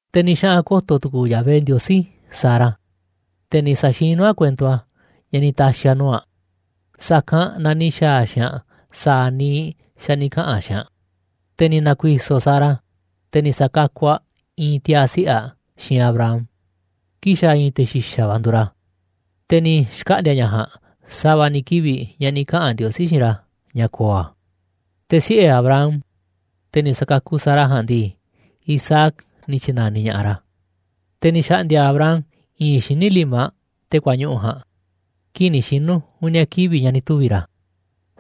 Te̱ ni̱ xaꞌa̱n ko̱to̱ tu̱ku̱u̱ Yahvé Ndiosí Sara, te̱ ni̱ sa̱xinu̱ a̱ kuento a̱, ña̱ ni̱ ta̱xi̱ a̱ nuu̱ꞌ aꞌ, sa̱kanꞌ na ni̱ xa̱a̱ a̱ xiinꞌ aꞌ sa̱a̱ niiꞌ xa̱ ni̱ kaꞌa̱n a̱ xiinꞌ aꞌ. Te̱ ni̱ na̱ku̱i̱so̱ Sara, te̱ ni̱ sa̱kakuꞌ aꞌ i̱i̱n tiaa̱ siꞌe̱ aꞌ xiinꞌ Abraham, kii̱ꞌ xa̱ i̱i̱n te̱ xi̱xa̱ va̱ nduuꞌ ra̱. Te̱ ni̱ xkaꞌndi̱a̱ ña̱ ja̱a̱nꞌ sa̱va̱ ni̱ kivi̱ꞌ ña̱ ni̱ kaꞌa̱n Ndiosí xiinꞌ ra̱ ña̱ ko̱o̱ a̱. Te̱ siꞌe̱ Abraham, te̱ ni̱ sa̱kakuꞌ Sara ja̱a̱nꞌ ndii, Isaac ni̱ tyi̱na̱niꞌ ña̱ꞌaꞌ ra̱. Te̱ ni̱ xa̱ꞌndi̱a̱ Abraham i̱i̱nꞌ xíniꞌ limaꞌ te̱ kuañuꞌu̱ ja̱a̱nꞌ kii̱ꞌ ni̱ xinu̱ uni̱a̱ kivi̱ꞌ ña̱ ni̱ tuvi̱ ra̱,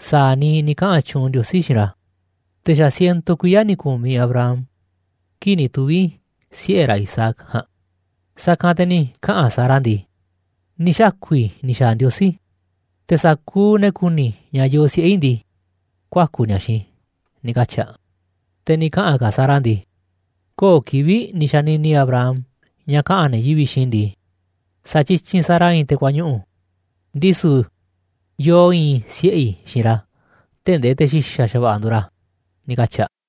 sa̱a̱ niiꞌ ni̱ kaꞌa̱n tyuunꞌ Ndiosí xiinꞌ ra̱. Te̱ xa̱ ciento kuiya̱ ni̱ ku̱miꞌ Abraham kii̱ꞌ ni̱ tuvi̱ siꞌe̱ ra̱ Isaac ja̱a̱nꞌ. Sa̱kanꞌ te̱ ni̱ kaꞌa̱n Sara ndii: ―Ni̱ xaku̱ i̱ ni̱ xa̱a̱ Ndiosí, te̱ sa̱kuuꞌ ne̱ ku̱ni̱ ña̱ yoo siꞌe̱ i̱ ndii, kuaku̱ ni̱a̱ xiinꞌ i̱ ―ni̱ katyi̱ a̱. Te̱ ni̱ kaꞌa̱n ka̱ Sara ndii: ―¡Köo̱ꞌ kivi̱ꞌ ni̱ xanini Abraham ña̱ kaꞌa̱n ne̱ yivi̱ꞌ xiinꞌ i̱ ndii, sa̱tyityinꞌ Sara i̱i̱n te̱ kuañuꞌu̱. Ndisu̱ yoo i̱i̱n siꞌe̱ i̱ xiinꞌ ra̱ tee̱ꞌ ndee te̱ xi̱xa̱ xa̱va̱ꞌa̱ nduuꞌ ra̱! ―ni̱ katyi̱ aꞌ.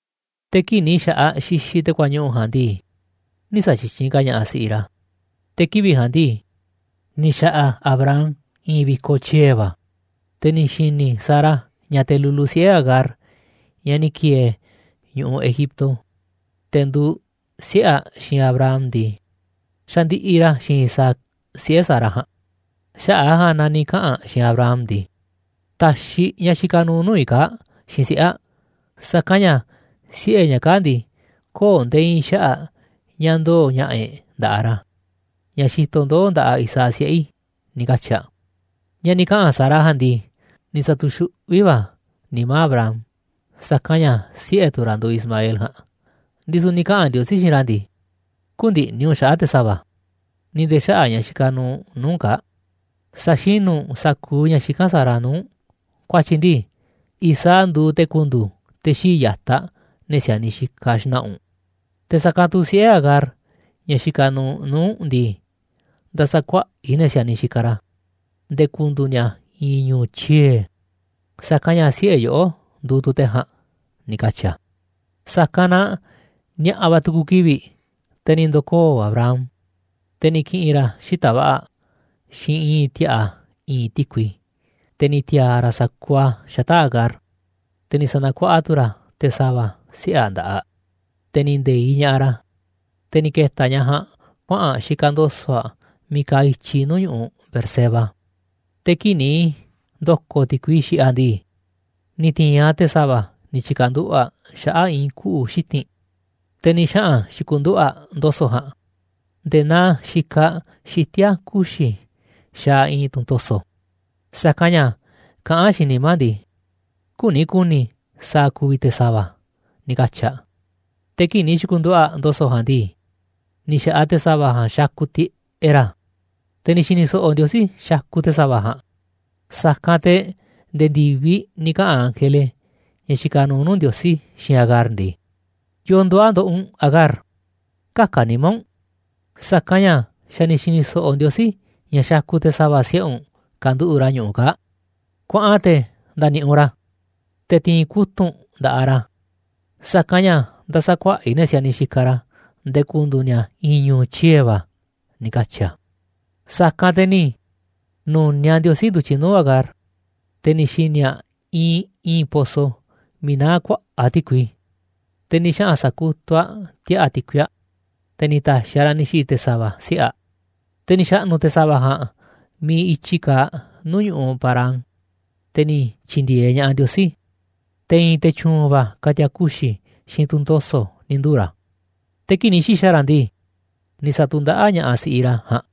Te̱ kii̱ꞌ ni̱ xa̱ꞌaꞌ xixiꞌ te̱ kuañuꞌu̱ ja̱a̱nꞌ ndii, nï̱ sa̱tyityinꞌ ka̱ ña̱ꞌaꞌ si̱ꞌiꞌ ra̱, te̱ kivi̱ꞌ ja̱a̱nꞌ ndii, ni̱ xa̱ꞌa̱ Abraham i̱i̱n vi̱koꞌ tyie̱ va̱. Te̱ ni̱ xi̱ni̱ Sara ña̱ te̱ lulu siꞌe̱ Agar, ñaꞌ ni̱ ki̱e̱e̱ ñu̱ꞌuꞌ Egipto, te̱ nduuꞌ siꞌe̱ aꞌ xiinꞌ Abraham ndii, xandiꞌiꞌ ra̱ xiinꞌ Isaac, siꞌe̱ Sara ja̱a̱nꞌ. Xaꞌa̱ꞌ a̱ ja̱a̱nꞌ na ni̱ kaꞌa̱n aꞌ xiinꞌ Abraham ndii: ―Ta̱xiꞌ ñaꞌ xikaꞌ nuuꞌ nuu̱ꞌ i̱ kaa̱ꞌ xiinꞌ siꞌe̱ aꞌ, sa̱kanꞌ ña̱ siꞌe̱ ñaꞌ kaa̱ꞌ ndii, köo̱ꞌ nde̱e̱ i̱i̱n xaꞌa̱ꞌ ña̱ ndoo̱ ña̱ꞌa̱ e̱ꞌ nda̱ꞌaꞌ ra̱, ña̱ xitoꞌ ndoo̱ nda̱ꞌaꞌ Isaac siꞌe̱ i̱ ―ni̱ katyi̱ aꞌ. Ña̱ ni̱ kaꞌa̱n Sara ja̱a̱nꞌ ndii, ni̱ sa̱tu̱xuꞌví va̱ a̱ nimá Abraham, sa̱kanꞌ ña̱ siꞌe̱ tu̱ ra̱ nduuꞌ Ismael ja̱a̱nꞌ, ndisu̱ ni̱ kaꞌa̱n Ndiosí xiinꞌ ra̱ ndii: ―Kü̱ndi̱ꞌni̱ u̱nꞌ xaꞌa̱ꞌ te̱ sa̱va̱, ni̱ nde̱e̱ xaꞌa̱ꞌ ñaꞌ xikaꞌ nuuꞌ nuu̱ꞌ u̱nꞌ kaa̱ꞌ. Sa̱xinu̱ u̱nꞌ sa̱kuuꞌ ña̱ xikán Sara nuu̱ꞌ u̱nꞌ, ku̱a̱tyi̱ ndii, Isaac nduuꞌ te̱ ku̱ndu̱u̱ te̱ xii̱ꞌ ya̱taꞌ ne̱ si̱a̱niꞌ xikaꞌ xna̱ꞌa̱ u̱nꞌ. Te̱ sa̱kanꞌ tu̱ siꞌe̱ Agar, ñaꞌ xikaꞌ nuuꞌ nuu̱ꞌ u̱nꞌ ndii, nda̱sa̱kuaꞌa̱ꞌ i̱ ne̱ si̱a̱niꞌ xikaꞌ ra̱, nde̱e̱ ku̱ndu̱u̱ ni̱a̱ i̱i̱n ñu̱u̱ tyie̱, sa̱kanꞌ ña̱ siꞌe̱ yoꞌó nduuꞌ tu̱ te̱ ja̱a̱nꞌ ―ni̱ katyi̱ a̱. Sa̱kanꞌ na ni̱a̱ꞌa̱ va̱ tu̱ku̱ kivi̱ꞌ, te̱ ni̱ ndo̱koo̱ Abraham, te̱ ni̱ ki̱ꞌi̱n ra̱ xita̱ꞌ va̱ꞌa̱, xiinꞌ i̱i̱n ti̱a̱ꞌa̱ i̱i̱nꞌ ti̱kui, te̱ ni̱ ti̱a̱a̱ ra̱ sa̱kuuꞌ a̱ xata̱ꞌ Agar, te̱ ni̱ sa̱na̱kuaꞌa tu̱ ra̱ te̱ sa̱va̱, siꞌe̱ aꞌ, nda̱ꞌaꞌ aꞌ, te̱ ni̱ nde̱iꞌ ña̱ꞌaꞌ ra̱. Te̱ ni̱ ke̱ta̱ ñaꞌ ja̱a̱nꞌ kuaꞌa̱n aꞌ xikaꞌ ndo̱so̱ꞌ aꞌ miiꞌ kaaꞌ i̱tyi nuu̱ꞌ ñu̱ꞌuꞌ Beerseba. Te̱ kii̱ꞌ ni̱ ndo̱ko̱ ti̱kui xiꞌiꞌ aꞌ ndii, ni̱ ti̱i̱n aꞌ te̱ sa̱va̱ ni̱ tyi̱ka̱nduꞌu̱ꞌ aꞌ xaꞌa̱ꞌ i̱i̱n kuꞌu̱ xiti̱nꞌ, te̱ ni̱ xaꞌa̱n xi̱ku̱nduꞌu̱ꞌ aꞌ ndo̱so̱ꞌ ja̱a̱nꞌ nde̱e̱ naa xikaꞌ xitíá kuxi̱ xaaꞌ i̱i̱n tunꞌ to̱so̱, sa̱kanꞌ ña̱ kaꞌán aꞌ xiinꞌ nimá aꞌ ndii: «Küni ku̱ni̱ i̱ sa̱a̱ ku̱vi̱ te̱ sa̱va̱», ni̱ katyi̱ aꞌ. Te̱ kii̱ꞌ ni̱ xi̱ku̱nduꞌu̱ꞌ aꞌ ndo̱so̱ꞌ ja̱a̱nꞌ ndii, ni̱ xa̱ꞌaꞌ te̱ sa̱va̱ ja̱a̱nꞌ xakuꞌ tiꞌeꞌ ra̱. Te̱ ni̱ xi̱ni̱ so̱ꞌo̱ Ndiosí xakuꞌ te̱ sa̱va̱ ja̱a̱nꞌ, sa̱kanꞌ te̱ nde̱e̱ ndi̱viꞌ ni̱ kaꞌa̱n ángele, ña̱ xikaꞌ nuuꞌ nuu̱ꞌ Ndiosí, xiinꞌ Agar ndii: ―¿Yo̱o̱ nduuꞌ a̱ ndoꞌoꞌ u̱nꞌ, Agar? Kä̱ka̱ nimá u̱nꞌ, sa̱kanꞌ ña̱ xa̱ ni̱ xi̱ni̱ so̱ꞌo̱ Ndiosí ña̱ xakuꞌ te̱ sa̱va̱ siꞌe̱ u̱nꞌ kanduꞌu̱ꞌ ra̱ ñu̱ꞌuꞌ kaa̱ꞌ. Kuaꞌan te̱ nda̱ni̱ꞌi̱ u̱nꞌ ra̱, te̱ ti̱i̱n kutu̱ꞌ u̱nꞌ nda̱ꞌaꞌ ra̱, sa̱kanꞌ ña̱ nda̱sa̱kuaꞌa̱ꞌ i̱ ne̱ si̱a̱niꞌ xikaꞌ ra̱ nde̱e̱ ku̱ndu̱u̱ ni̱a̱ i̱i̱n ñu̱u̱ tyie̱ va̱ ―ni̱ katyi̱ a̱. Sa̱kanꞌ te̱ ni̱ nu̱niaꞌ Ndiosí ndu̱tyiꞌ nuu̱ꞌ Agar, te̱ ni̱ xi̱ni̱ aꞌ iinꞌ i̱i̱n pozo miiꞌ naá kuaꞌa̱ꞌ ti̱kui, te̱ ni̱ xaꞌa̱n sa̱kutuꞌ aꞌ ti̱a̱ꞌa̱ ti̱kui aꞌ, te̱ ni̱ ta̱xi̱ aꞌ raꞌ ni̱ xi̱ꞌi̱ te̱ sa̱va̱ siꞌe̱ aꞌ. Te̱ ni̱ xa̱ꞌnu̱ te̱ sa̱va̱ ja̱a̱nꞌ miiꞌ i̱tyi kaaꞌ nuu̱ꞌ ñu̱ꞌuꞌ Parán, te̱ ni̱ tyi̱ndi̱e̱eꞌ ña̱ꞌaꞌ Ndiosí. Te̱ i̱i̱n te̱ tyu̱u̱n va̱ ka̱ti̱a̱ kuxi̱ xiinꞌ tunꞌ to̱so̱ ni̱ nduu̱ ra̱. Te̱ kii̱ꞌ ni̱ xi̱xa̱ ra̱ ndii, ni̱ sa̱tu̱ndaꞌáꞌ ña̱ꞌaꞌ si̱ꞌiꞌ ra̱ ja̱a̱nꞌ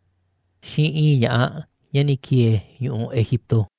xiinꞌ i̱i̱n ña̱ꞌaꞌ ña̱ ni̱ ki̱e̱e̱ ñu̱ꞌuꞌ Egipto.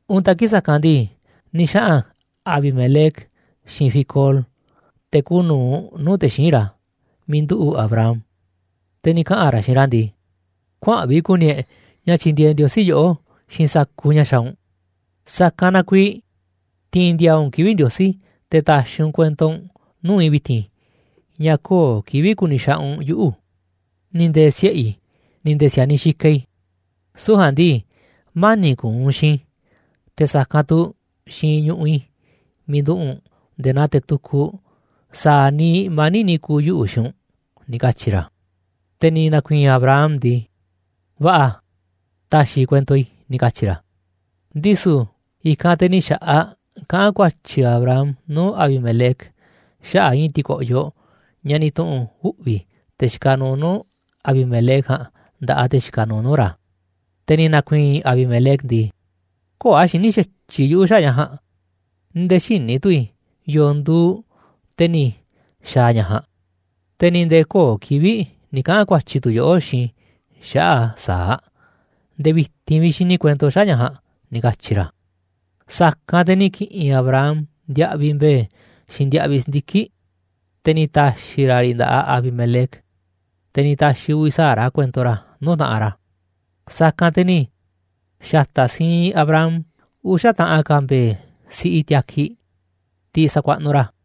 Untaꞌ kii̱ꞌ sa̱kanꞌ ndii, ni̱ xaꞌa̱n Abimelec xiinꞌ Ficol, te̱ kuuꞌ nu̱uꞌ nuu̱ꞌ te̱ xíinꞌ ra̱, miiꞌ nduꞌu̱ꞌ Abraham, te̱ ni̱ kaꞌa̱n ra̱ xiinꞌ ra̱ ndii: ―Kuaa̱nꞌ vi̱ꞌ ku̱ni̱ e̱ꞌ ña̱ tyindieeꞌ Ndiosí yoꞌó xiinꞌ sa̱kuuꞌ ña̱ xaaꞌ u̱nꞌ. Sa̱kanꞌ na kuiiꞌ ti̱i̱n ndi̱a̱a̱ u̱nꞌ kivi̱ꞌ Ndiosí, te̱ ta̱xi̱ u̱nꞌ kuento u̱nꞌ nuu̱ꞌ i̱ vi̱ti̱n ña̱ köo̱ꞌ kivi̱ꞌ ku̱ni̱ xaꞌanꞌ u̱nꞌ yuꞌu̱, ni̱ nde̱e̱ siꞌe̱ i̱, ni̱ nde̱e̱ si̱a̱niꞌ xikaꞌ i̱, süu̱ꞌ ja̱a̱nꞌ ndii, mani̱ꞌ ku̱u̱ u̱nꞌ xiinꞌ i̱, te̱ sa̱kanꞌ tu̱ xiinꞌ ñu̱ꞌuꞌ i̱ miiꞌ nduꞌu̱ꞌ u̱nꞌ nde̱e̱ naa te̱ tukuꞌ sa̱a̱ niiꞌ mani̱ꞌ ni̱ ku̱u̱ yuꞌu̱ xiinꞌ u̱nꞌ ―ni̱ katyi̱ ra̱. Te̱ ni̱ na̱ku̱i̱i̱n Abraham ndii: ―Va̱ꞌa̱, ta̱xi̱ i̱ kuento i̱ ―ni̱ katyi̱ ra̱. Ndisu̱ i̱kanꞌ te̱ ni̱ xa̱ꞌaꞌ kaꞌán ku̱a̱tyi̱ Abraham nuu̱ꞌ Abimelec xaꞌa̱ꞌ i̱i̱n ti̱ko̱ꞌyoꞌ ña̱ ni̱ tu̱ꞌu̱n uꞌvi̱ te̱ xikaꞌ nuuꞌ nuu̱ꞌ Abimelec ja̱a̱nꞌ nda̱ꞌaꞌ te̱ xikaꞌ nuuꞌ nuu̱ꞌ ra̱. Te̱ ni̱ na̱ku̱i̱i̱n Abimelec ndii: ―Köo̱ꞌ a̱ xiní xa̱tyiꞌ yuꞌu̱ xaꞌa̱ꞌ ña̱ ja̱a̱nꞌ, ni̱ nde̱e̱ xïní tu̱ i̱ yo̱o̱ nduuꞌ te̱ ni̱ xa̱a̱ ña̱ ja̱a̱nꞌ, te̱ ni̱ nde̱e̱ köo̱ꞌ kivi̱ꞌ ni̱ kaꞌa̱n ku̱a̱tyi̱ tu̱ yoꞌó xiinꞌ i̱ xaꞌa̱ꞌ a̱ sa̱aꞌ. Nde̱e̱ vi̱ti̱n vi̱ꞌ xini i̱ kuento xaꞌa̱ꞌ ña̱ ja̱a̱nꞌ ―ni̱ katyi̱ ra̱. Sa̱kanꞌ te̱ ni̱ ki̱ꞌi̱n Abraham ndiaꞌviꞌ mbe̱e̱ xiinꞌ ndiaꞌviꞌ si̱ndiki̱ꞌ, te̱ ni̱ ta̱xi̱ ra̱ riꞌ nda̱ꞌaꞌ Abimelec, te̱ ni̱ ta̱xi̱ uvi̱ sa̱aꞌ ra̱ kuento ra̱ nuu̱ꞌ taꞌanꞌ ra̱. Sa̱kanꞌ te̱ ni̱ xa̱ta̱ siinꞌ Abraham uxa̱ taꞌan ka̱ mbe̱e̱ siꞌi tiakiꞌ, tiꞌ sakuaꞌnuꞌ ra̱.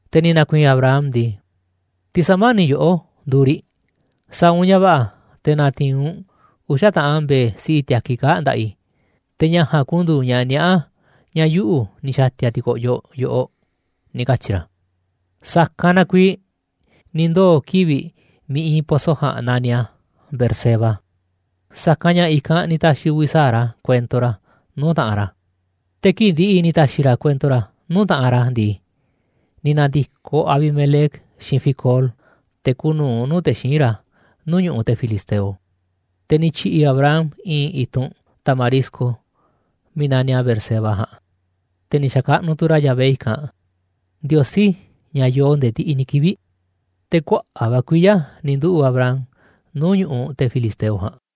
Te̱ ni̱ na̱ku̱i̱i̱n Abraham ndii: ―Tiꞌ sa̱mani̱ꞌ i̱ yoꞌó nduuꞌ riꞌ. Sa̱a̱ u̱nꞌ ña̱ va̱ꞌa̱, te̱ na̱ti̱i̱n u̱nꞌ uxa̱ taꞌan mbe̱e̱ siꞌi tiakiꞌ kaa̱ꞌ nda̱ꞌaꞌ i̱, te̱ ña̱ ja̱a̱nꞌ ku̱ndu̱u̱ ña̱ niaꞌá ña̱ yuꞌu̱ ni̱ xa̱ti̱a̱ ti̱ko̱ꞌyoꞌ yoꞌoꞌ ―ni̱ katyi̱ ra̱. Sa̱kanꞌ na kuiiꞌ ni̱ ndoo̱ kivi̱ꞌ miiꞌ iinꞌ pozo ja̱a̱nꞌ naniꞌ a̱ Beerseba, sa̱kanꞌ ña̱ i̱kanꞌ ni̱ ta̱xi̱ uvi̱ sa̱aꞌ ra̱ kuento ra̱ nuu̱ꞌ taꞌanꞌ ra̱. Te̱ kii̱ꞌ ndi̱ꞌi̱ ni̱ ta̱xi̱ ra̱ kuento ra̱ nuu̱ꞌ taꞌanꞌ ra̱ ndii, ni̱ na̱ndi̱koꞌ Abimelec xiinꞌ Ficol, te̱ kuuꞌ nu̱uꞌ nuu̱ꞌ te̱ xíinꞌ ra̱, nuu̱ꞌ ñu̱ꞌuꞌ te̱ filisteo. Te̱ ni̱ tyi̱ꞌi̱ Abraham i̱i̱n i̱tunꞌ tamarisco miiꞌ na̱niꞌ a̱ Beerseba ja̱a̱nꞌ, te̱ ni̱ xa̱kaꞌnuꞌ tu̱ ra̱ Yahvé i̱kanꞌ, Ndiosí ña̱ yoo nde̱e̱ ndiꞌiꞌ ni̱ kivi̱ꞌ. Te̱ kuaꞌa̱ꞌ va̱ kuiya̱ ni̱ nduꞌu̱ꞌ Abraham nuu̱ꞌ ñu̱ꞌuꞌ te̱ filisteo ja̱a̱nꞌ.